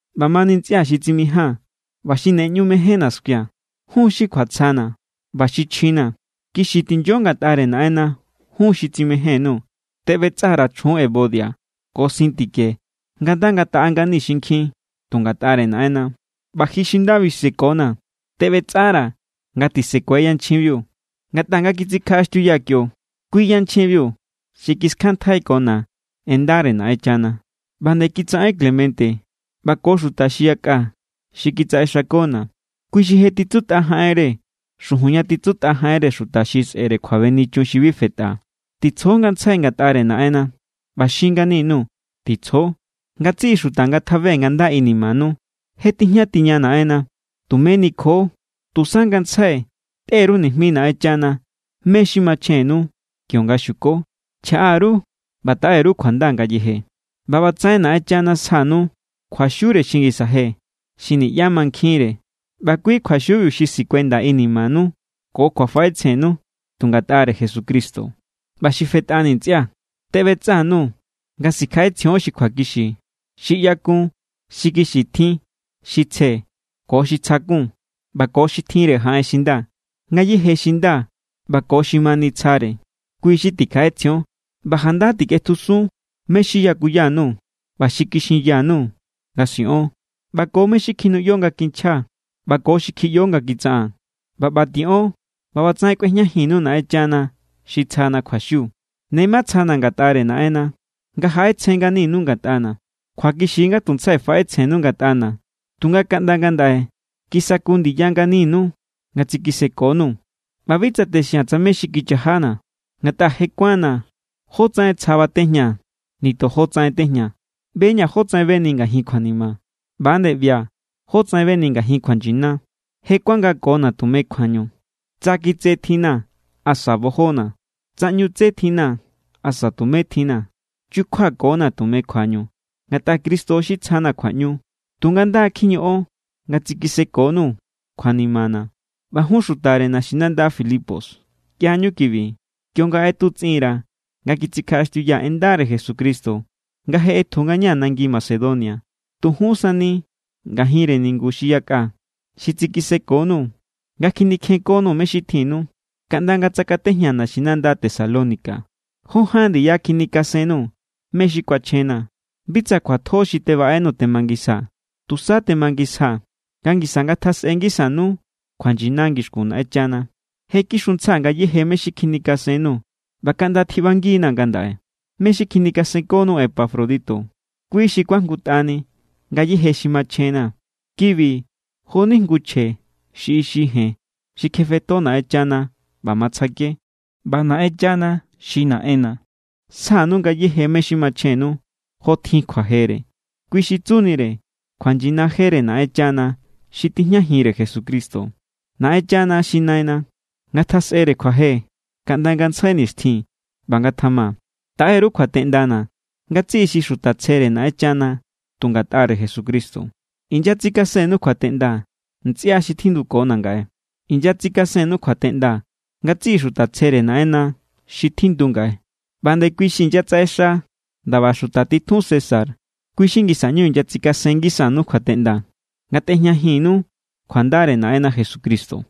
ꞌBamani ntsꞌia̱ xi tsimijaa̱n ꞌba xi ne ꞌñu mejénna̱ skuia̱, jun xi kjuatsjana̱ ꞌba xi chjina̱, kixi tinyo ngatꞌare Naꞌenna, jun xi tsimején_nuu̱. Tebꞌetsa_ra̱ chjun Evodia ko Síntique nga nda ngataꞌa ngani xinkjin tu ngatꞌare Naꞌenna. ꞌBa ji xi nda bisekona̱, teꞌbetsꞌara̱ nga tisekue yanchjinbiu. Ngatꞌa nga kitsikjaꞌaxtiuyaa̱ kio, kui yanchjinbiu xi kiskjanntjaikona̱ en ndare Naꞌenchana. ꞌBa nde kitsaꞌen Clemente ꞌba ko xuta xi yakꞌa xi kitsaꞌexakona̱. Kui xi je titsutꞌa jaꞌenre xujun ña titsutꞌa jaꞌenre xuta xi sꞌe̱re kjuabenichun xi bi fetꞌa. Titsjo ngantsjai ngatꞌare Naꞌenna. ꞌBa xin ngani_nuu̱, ¡Titsjo! Ngatsiꞌi xuta ngatjabe nga nda inimanu. Je tijña tiña Naꞌenna. Tumé nikjo. Tusa ngantsjai tꞌe_ru nijmi Naꞌenchana mé= xi machjennu kionga xiuko. Chjaꞌa_ru ꞌba taꞌe_ru kjuanda ngayeje. ꞌBa ꞌbatsaꞌen Naꞌenchana sjanu kjuaxiure xi ngisa je, xi niꞌyá mankjinre. ꞌBa kui kjuaxiubiu xi sikuenda inimanu ko kjuafaꞌetsjennu tu ngatꞌare Jesucristo. ꞌBa xi fetꞌani ntsꞌia̱, teꞌbetsꞌa_nuu̱ nga sikjaꞌetsjion xi kjuakixi, xi ꞌyakun, xi kixi tjin, xi tsje, ko xi tsja kun, ꞌba ko xi tjinre jaꞌen xi nda. Ngayéje xi nda ꞌba ko xi ma nitsjare, kui= xi tikjaꞌetsjion. ꞌBa janda tikꞌetjusun mé= xi yakuya_nuu̱ ꞌba xi kixinya_nuu̱ nga siꞌon, ꞌba ko mé= xi kjinuꞌyo nga kinchjaa̱ ꞌba ko xi kjiꞌyo nga kitsaꞌaa̱n. ꞌBa ꞌba tiꞌon, ꞌba ꞌbatsaꞌen kꞌuejñajinnu Naꞌenchana xi tsjana kjuaxiu. Ne matsjana̱ ngatꞌare Naꞌenna nga jaꞌetsjen nganinu ngatꞌana̱. Kjuakixi= nga tuntsjai faꞌetsjennu ngatꞌana̱, tunga kaꞌnda ngandaꞌe kisaku ndiya nganinu nga tsikisekonuu̱. ꞌBa bi tsa texia̱n tsa mé= xi chajana̱. Ngatꞌa je kuánna̱ jótsaꞌen tsja batejñaa̱ nitojo tsaꞌen tejñaa̱. ꞌBe=ña̱ jotsaꞌen beni ngajin kjuanima ꞌba=nde ꞌbia̱ jotsaꞌen beni ngajin kjuanyina. Je kuangakona̱ tume kjuañu, tsa kitse tjinna̱ asa bojona̱, tsa ꞌñu tse tjinna̱ asa tumé tjinna̱. Chukjuakona̱ tume kjuañu, ngatꞌa Cristo xi tsjana̱ kjuaꞌñu. Tunga nda kjiñoꞌon nga tsikisekonuu̱ kjuanimana̱. ꞌBa jun xutare naxinanda Filipos ꞌyañu kibi. Kionga ꞌetutsꞌinra̱ nga kitsikjaꞌaxtiuyaa̱ en ndare Jesucristo nga je ꞌetju ngañaa̱ nangi Macedonia, tu jun sani ngajinre ningu xi yakꞌa xi tsikisekonuu̱ nga kjinikjenkonuu̱ me xi tjinnu. Kaꞌnda nga tsakatejñaa̱ naxinanda Tesalónica, jó ján ndiya kjinikasennuu̱ mé= xi kuachjena̱. Bi tsa kjuatjo xi tebaꞌenuu̱ temangisjaa̱. Tusa temangisjaa̱ nga ngisa ngatjasꞌe ngisanu kjuanyina ngixkun Naꞌenchana. Je kixuntsjaa̱ ngayéje mé= xi kjinikasennuu̱ ꞌba kaꞌnda tjiꞌbangi=na̱ ngandaꞌe. Mé xi kjinikasenkonuu̱ Epafrodito, kui= xi kuajngutꞌani ngayéje xi machjenna̱. Kibi jo=ni jngu chje xi ixi jen xi kjebetjo Naꞌenchana ꞌba matsjake. ꞌBa Naꞌenchana xi Naꞌenna̱ sjanu ngayéje mé= xi machjennu, jo tjin kjuajere, kui xi tsunire kjuanyina jere Naꞌenchana xi tijñajinre Jesucristo. ¡Naꞌenchana xi Naina, ngatjasꞌere kjuaje kaꞌnda ngantsjai nixtjin! ꞌBa ngatjama. Taꞌe_ru kjuateꞌndana̱ ngatsiꞌi xi xuta tsjere Naꞌenchana tu ngatꞌare Jesucristo. Inyatsikasennu kjuateꞌnda ntsꞌia xi tjindukona̱ ngaꞌe. Inyatsikasennu kjuateꞌnda ngatsiꞌi xuta tsjere Naꞌenna xi tjindu ngaꞌe. ꞌBa nde kui xi inyatsaꞌexa ndaba xuta titjun César, kui xi ngisa ꞌñu inyatsikasen ngisanu kjuateꞌnda. Ngatꞌejñajinnu kjuandare Naꞌenna Jesucristo.